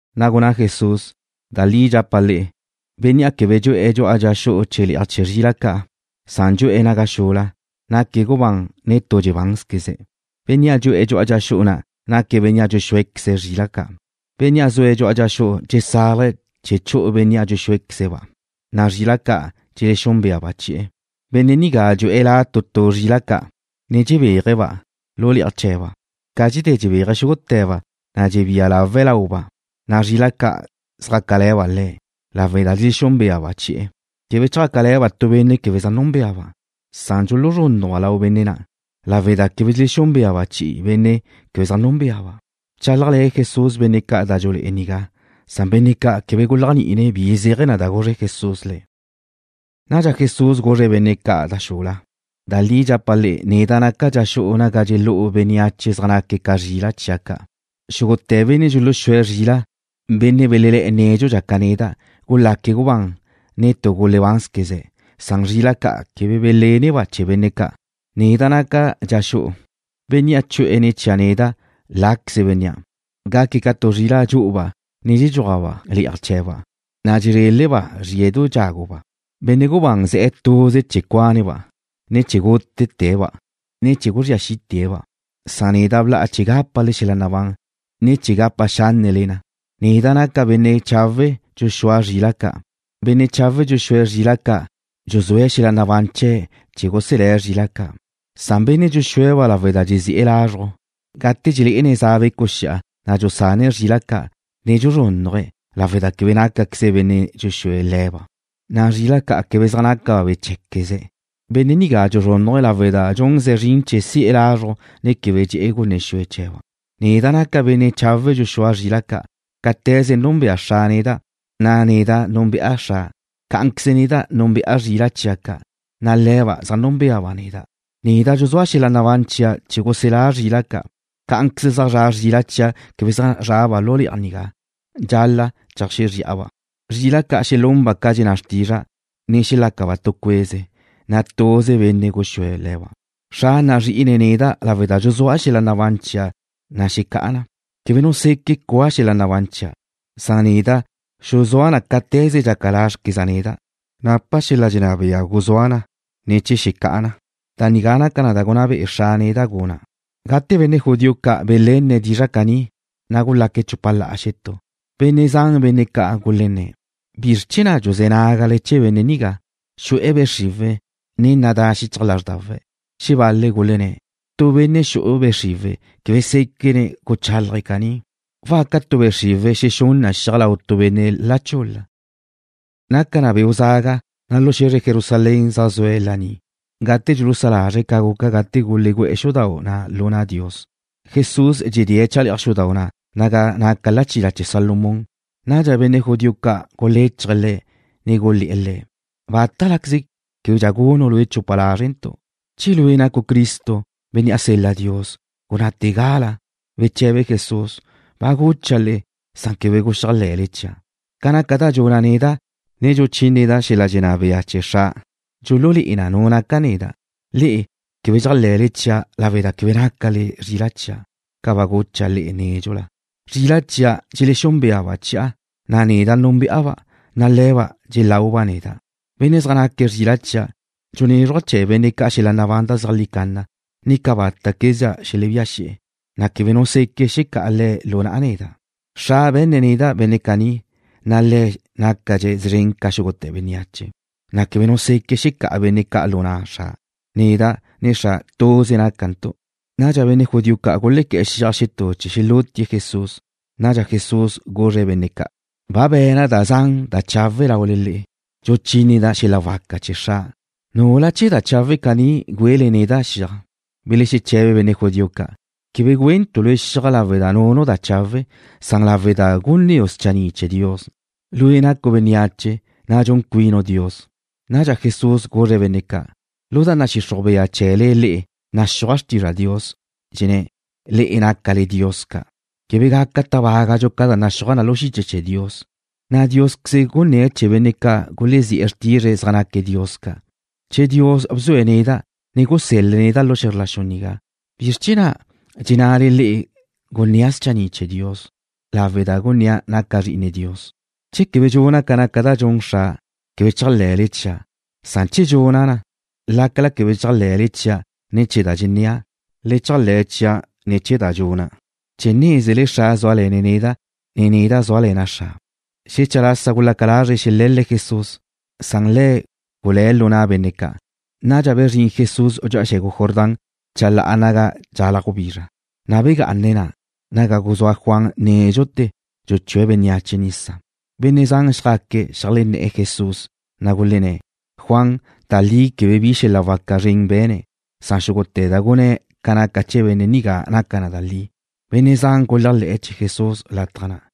Na' gunná Jesús: ―Da li dxapa' le'e, bénnea' quebe dxu'e̱ dxu'a dxa xu'u chee̱ le'aj chee̱ zrila' ca', na' dxu'e̱ naga xula, naque̱' gubán, ne tu dxebánzqueze̱'. Bénnea' dxu'e̱ dxu'a dxa xu'u na' naque̱' benne' dxuxúequeze̱' zrila' ca'. Bénnea' zue̱' dxu'a dxa xu'u dxesálaje̱' chee̱ chu'u bénnea' dxuxúequeze̱'-ba', na' zrila' ca' dxelexúnbeaba' chi'e̱. Benne' nigá dxu'e̱ la tu tu zrila' ca', ne dxebéaje̱'-ba' lu le'aj chee̱ba'. Ca dxedé dxebéaje̱' xúgute̱ba', na' dxebía lawe̱' lauba', na' zrila' ca' zjácale̱ba' Le̱', lawe' da dxelexúnbeaba' chi'e̱. Quebe zjácale̱ba' tu benne' quebe zaj núnbeaba'. Dxuluzrúnnujba' lau benne' na' lawe' da quebe dxelexúnbeaba' chi'i benne' quebe zaj núnbeaba'. Bchálajle̱ Jesús benne' ca' da dxulé'e nigá, na' benne' ca' quebe guléajni'ine̱' bi zéaje̱ da guzre Jesús le̱'. Nadxa Jesús guzre̱' benne' ca' da xula: ―Da li dxapa' le'e, neda' naca' dxa xu'u naga dxelú'u bénneache zaj naque̱' ca zrila' chia' ca'. Xúgute̱ benne' dxuluxúe̱' zrila', benne' belelé̱'e̱ nédxudxa ca neda', gulaque̱' gubán, ne tu gulebánzqueze̱'. Zrila' ca' quebe beléneba' chee̱ benne' ca'. Neda' naca' dxa xu'u. Bénnea' chu'e̱ ne̱ chia' neda', láqueze bénnea'. Gaque̱' ca tu zrila' dxu'uba', ne dxuajba' le'aj chee̱ba', na' dxezréleba' zríe̱du dxáguba'. ’Benne' gubán ze̱'e̱ tuze chee̱ cuane̱'-ba', ne chee̱ gútete̱'-ba, ne chee̱ guzría xi'te̱'-ba'. Neda' bla'a chee̱ gápale xel-la' nabán, ne chee̱ gapa xánnele na. Neda' naca' benne' chawe' dxuxúa' zrila' ca'. Benne' chawe' dxuxúe̱' zrila' ca' dxuzúe̱' xel-la' nabán chee̱' chee̱ guselé̱' zrila' ca'. Benne' dxuxúe̱'-ba' lawe' da dxezi'e̱ lazruj, gate dxelé'ene̱' za becu' xi'a, na' dxusane̱' zrila' ca', ne dxuzrúnnuje̱', lawe' da quebe nácaqueze̱' benne' dxuxúe̱' le̱ba', na' zrila' ca' quebe zaj nácaba' be̱ cheé̱zqueze̱'. Benne' nigá dxuzrúnnuje̱' lawe' da dxunze̱' zrin chee̱ si'e̱ lázruje̱', na' quebe dxe'e̱ gunne xue chee̱ba'. ’Neda' naca' benne' chawe' dxuxúa' zrila' ca'. Cáte̱ze núnbea Xra' neda', na' neda' núnbe'a Xra', cá'anqueze neda' núnbe'a zrila' chia' ca', na' le̱ba' zaj núnbeaba' neda'. Neda' dxuzúa' xel-la' nabán chia' chee̱ guselá' zrila' ca'. Cá'anqueze zaj zra' zrila' chia' quebe zaj zraba' lu le'aj nigá. Dxal-la' cheajxexri'a-ba'. Zrila' ca' xelunba' ca dxenná xrtizra', ne xelácaba' tu cueze, na' tuze benne' guxúe̱' le̱ba'. ’Xra' nazrí'ine̱' neda' lawe' da dxuzúa' xel-la' nabán chia', na' xecá'a na. Quebe nu seque' cua xel-la' nabán chia'. Neda' xuzúa' na cáte̱ze dxaca lázrequeza' neda'. Napa' xel-la' dxenná bea guzúa' na, ne chee̱ xecá'a na. Da nigá naca na da gunná be'e Xra' neda' guna'. Gate benne' judío ca' belenne̱' dizra' caní, na' gulaque̱' chupa la'a xetú. Benne' zan benne' ca' gulenné̱': ―¿Bizr chee̱ na' dxuzé̱ nágale chee̱ benne' nigá? Xu'e̱ be' xriwe̱', ne nadá xichaj lázrdawe̱'. Xebal-le̱' gulenné̱': ―Tu benne' xu'e̱ be' xriwe̱' quebe séquene̱' guchálaje̱' caní. ¿Waca tu be' xriwe̱' xexún na xiaj lau tu benne' la chul-la? Naca na beu' zaga, na' lu xe̱zre Jerusalén zaj zue̱' laní gate dxulusá lazre̱' ca guca gate gulegú'e̱ xudau' na' lu na' Dios. Jesús dxedé̱' chale'aj xudau' na' naga naca lachila chee̱ Salomón. Nadxa benne' judío ca' guléchaje̱' Le̱', ne gulé̱'e̱ Le̱': ―¿Bátalaqueze québedxa gunu' lue' chupa lázrentu'? Che lue' nacu' Cristo, Bénnea' sel-la Dios, gunnáte̱gala. Beche̱be Jesús: ―Ba gucha' le'e, na' quebe guxéajle̱le chia'. Ca naca da dxuna' neda', ne dxuchíneda' xel-la' dxenná bea chee̱ Xra', dxululé'e na nu naca' neda'. Le'e quebe dxéajle̱le chia' lawe' da quebe nácale zrila' chia', ca ba gucha' le'e nédxula. Zrila' chia' dxelexúnbeaba' chi'a, na' neda' núnbe'a-ba', na' le̱ba' dxelauba' neda'. Benne' zaj naque̱' zrila' chia', dxunézruja' chee̱ benne' ca' xel-la' nabán da zeajlí canna, ne cabáta'quezdxa xelebía xi'e̱, na' quebe nu seque' xecá'a le̱' lu na'a neda'. Xra' be̱nne̱' neda' benne' caní, na' Le̱' nácadxe̱' szren ca xúgute̱ bénneache, na' quebe nu seque' xecá'a benne' ca' lu na' Xra'. Neda', ne Xra' tuze nácantu'. Nadxa benne' judío ca' gulequé̱'e̱ xiaj xetú chee̱ xelútie̱' Jesús. Nadxa Jesús guzre̱' benne' ca': ―Ba bé̱nqueza' da zan da chawe' laule le'e, dxuchíneda' xel-la' waca chee̱ Xra'. ¿Nula chee̱ da chawe' caní güele neda' xiaj? Belexeche̱be benne' judío ca': ―Quebe güentu' lue' xiaj lawe' da nunu' da chawe'. Dxuntu' na lawe' da gunnéu' schanni' chee̱ Dios. Lue' nacu' bénneache, na' dxun cuinu' Dios. Nadxa Jesús guzre̱' benne' ca': ―Lu da nadxixruj bea chee̱le le'e naxúaj xrtizra' Dios, dxenná na: Le'e nácale dios ca'. Quebe gaca tábagadxu ca da naxúaj na lu xiche chee̱ Dios, na' Diósqueze̱' gunné̱' chee̱ benne' ca' gulezí'e̱ xrtizre̱' zaj naque̱' dios ca'. Che Dios bzue̱' neda', ne gusél-le̱' neda' lu xe̱zr la xu nigá, ¿bizr chee̱ na' dxennale le'e gunnéa' schanni' chee̱ Dios lawe' da gunnéa' naca' Zri'ine Dios? Che quebe dxuna' ca naca da dxun Xra', quebe chéajle̱le chia'. Che dxuna' na, lácala quebe dxéajle̱le chia' ne̱ chee̱ da dxennéa', le chéajle̱ chia' ne̱ chee̱ da ca' dxuna', chee̱ nézele Xra' zúale̱ne̱' neda', na' neda' zúale̱na' Xra'. Xetú lasa gulaca lazre̱' xele̱l-le̱' Jesús, na' Le̱' gulé̱' lu na' benne' ca'. Nadxa bezrín Jesús dxu'a xe̱gu Jordán chalá'a naga dxalaj gubizra, na' begá'ane̱' na', naga guzúa Juan nédxute̱ dxuchúe̱' bénneache nisa. Benne' zan xjaque̱' xeajlenné̱'e̱ Jesús, na' gulenné̱': ―Juan, da li quebe bi xel-la' waca zren be̱ne̱', na' xúgute̱ da gunné̱' ca naca chee̱ benne' nigá naca na da li. Benne' zan guléajle̱'e̱ chee̱ Jesús lataj na'.